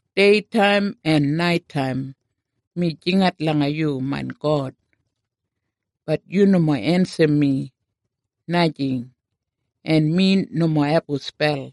Deitaim en naitaim mi jingat langa yu, main God, bat yu nomo ensim mi, najing, en mi nomo abum spel.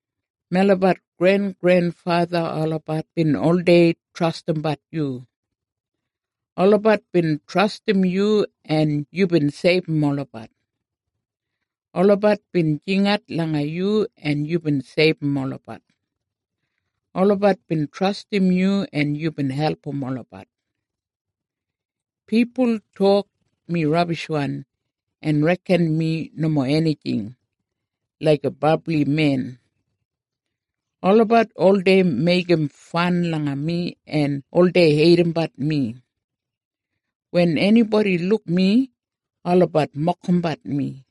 Melabat grengrenfatha olabat bin oldei trastimbat yu. Olabat bin trastim yu en yubin seibum olabat. Olabat bin jingat langa yu en yubin seibum olabat. Olabat bin trastim yu en yubin album olabat. Pipul tok mi rabishwan en reken mi nomo enijing, laiga brabli men. Olabat oldei meigim fan langa mi en oldei heidimbat mi. Wen enibodi luk mi, olabat mokimbat mi.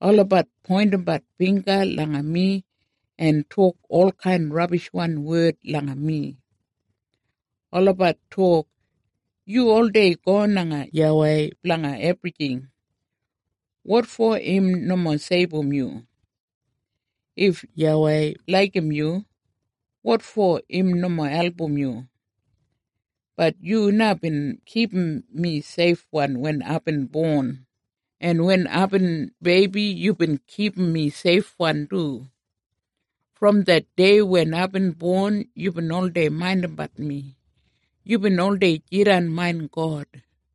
Olabat poindimbat bingga langa mi en tok olkain rabishwan wed langa mi. Olabat tok, “Yu oldei go langa YAWEI blanga ebrijing. Wotfo im nomo seibum yu? If YAWEI laigim yu, wotfo im nomo album yu?” Bat yu na bin kipum mi seifwan wen aibin bon, en wen aibin beibi yubin kipum mi seifwan du. Brom det dei wen aibin bon, yubin oldei maindimbat mi. Yubin oldei jidan main God.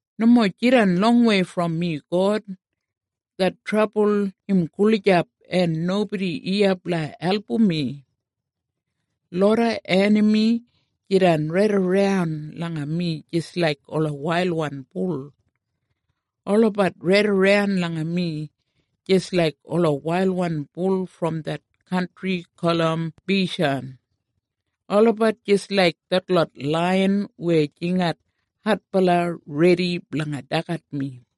Nomo jidan longwei brom mi God. Det trabul im gulijap en nobodi iya blanga album mi. Loda enami jidan raidaran langa mi jis laik ola wailwan bul. Olabat raidaran langa mi, jis laik ola wailwan bul brom det kantri gulum Beishan. Olabat jis laik detlot laiyan weya jingat adbala redi blanga dagat mi.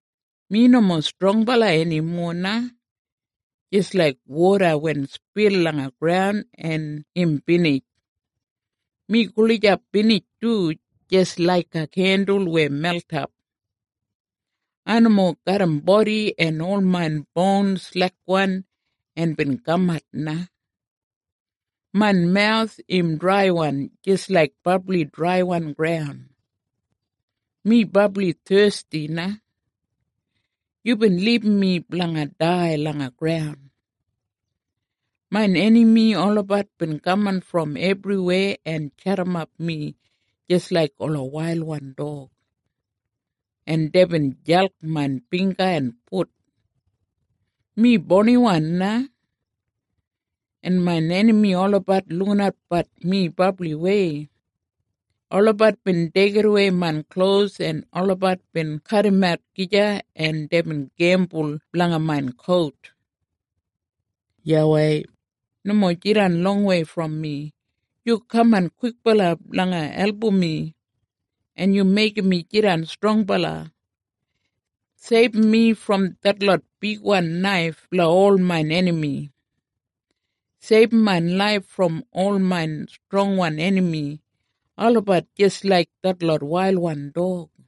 Mi nomo strongbala enimo na, jis laik woda wen spil langa graun en im binij. Mi gulijap binij du, jis laiga kendul weya meltap. Ai nomo garram bodi en ol main boun slekwan en bin kamat na. Main mawus im draiwan jis laik brabli draiwan graun. Mi brabli thesti na. Yubin libum mi blanga dai langa graun. Main enami olabat bin kaman brom ebriweya en jadimap mi jis laik ola wailwan dog, en deibin jalk main bingga en fut. Mi bouniwan na, en main enami olabat lukinatbat mi brabliwei. Olabat bin deigidawei main klos en olabat bin kadimat gija, en deibin gembul blanga main kout. YAWEI, nomo jidan longwei brom mi. Yu kaman kwikbala blanga album mi, en yu meigim mi jidan strongbala. Seibum mi brom detlot bigwan naif blanga ol main enami. Seibum main laif brom ol main strongwan enami. Olabat jis laik detlot wailwan dog.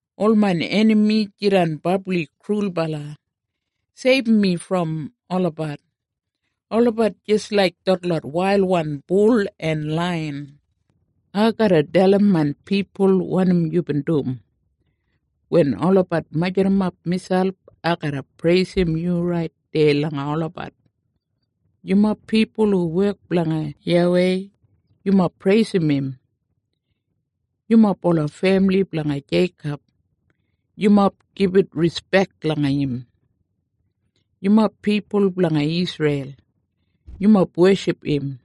Ol main enami jidan brabli krulbala. Seibum mi brom olabat. Olabat jis laik detlot wailwan bul en laiyan. Ai garra dalim main pipul wanim yubin dum. Wen olabat majurrumap miselp, ai garra preisim yu rait deya langa olabat. Yumob pipul hu wek blanga YAWEI, yumob preisim im. Yumob ola femili blanga Jeikob, yumob gibit rispek langa im. Yumob pipul blanga Isreil, yumob weship im.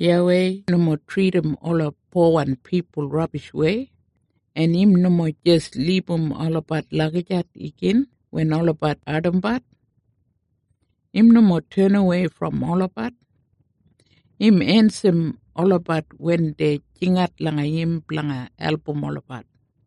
YAWEI nomo tridim ola powan pipul rabishwei, en im nomo jis libum olabat lagijat igin wen olabat ardimbat. Im nomo tenawei brom olabat. Im ensim olabat wen dei jingat langa im blanga album olabat.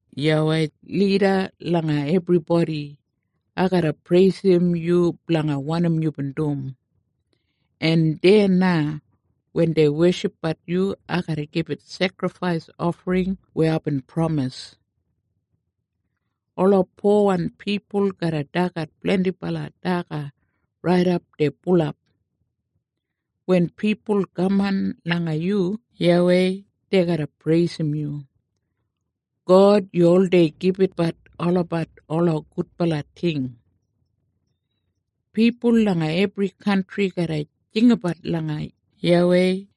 YAWEI, lida langa ebribodi, ai garra preisim yu blanga wanim yubin dum. En deya na wen dei weshipbat yu, ai garra gibit sekrifais ofring weya aibin pramis. Ola powan pipul garra dagat blendibala daga raidap dei bulap. Wen pipul kaman langa yu YAWEI, dei garra preisim yu. God, yu oldei gibitbat olabat ola gudbala ting. Pipul langa ebri kantri garra jinggabat langa YAWEI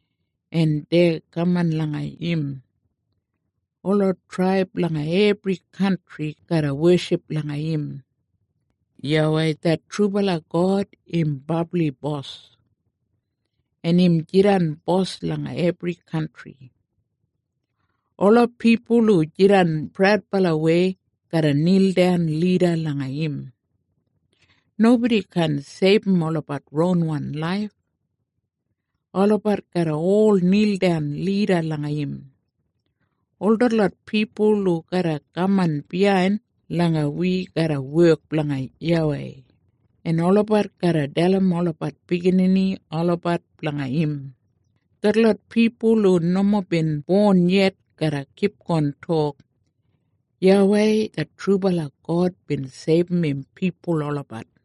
en dei kaman langa im. Ola traib langa ebri kantri garra weship langa im. YAWEI det trubala God im brabli Bos, en im jidan Bos langa ebri kantri. Ola pipul hu jidan praudbalawei garra nildan lida langa im. Nobodi kaan seibum olabat ronwan laif. Olabat garra ol nildan lida langa im. Ol detlot pipul hu garra kaman biyain langa wi garra wek blanga YAWEI, en olabat garra dalim olabat biginini olabat blanga im. Detlot pipul hu nomo bin bon yet garra kipgon tok, “YAWEI det trubala God bin seibum im pipul olabat.”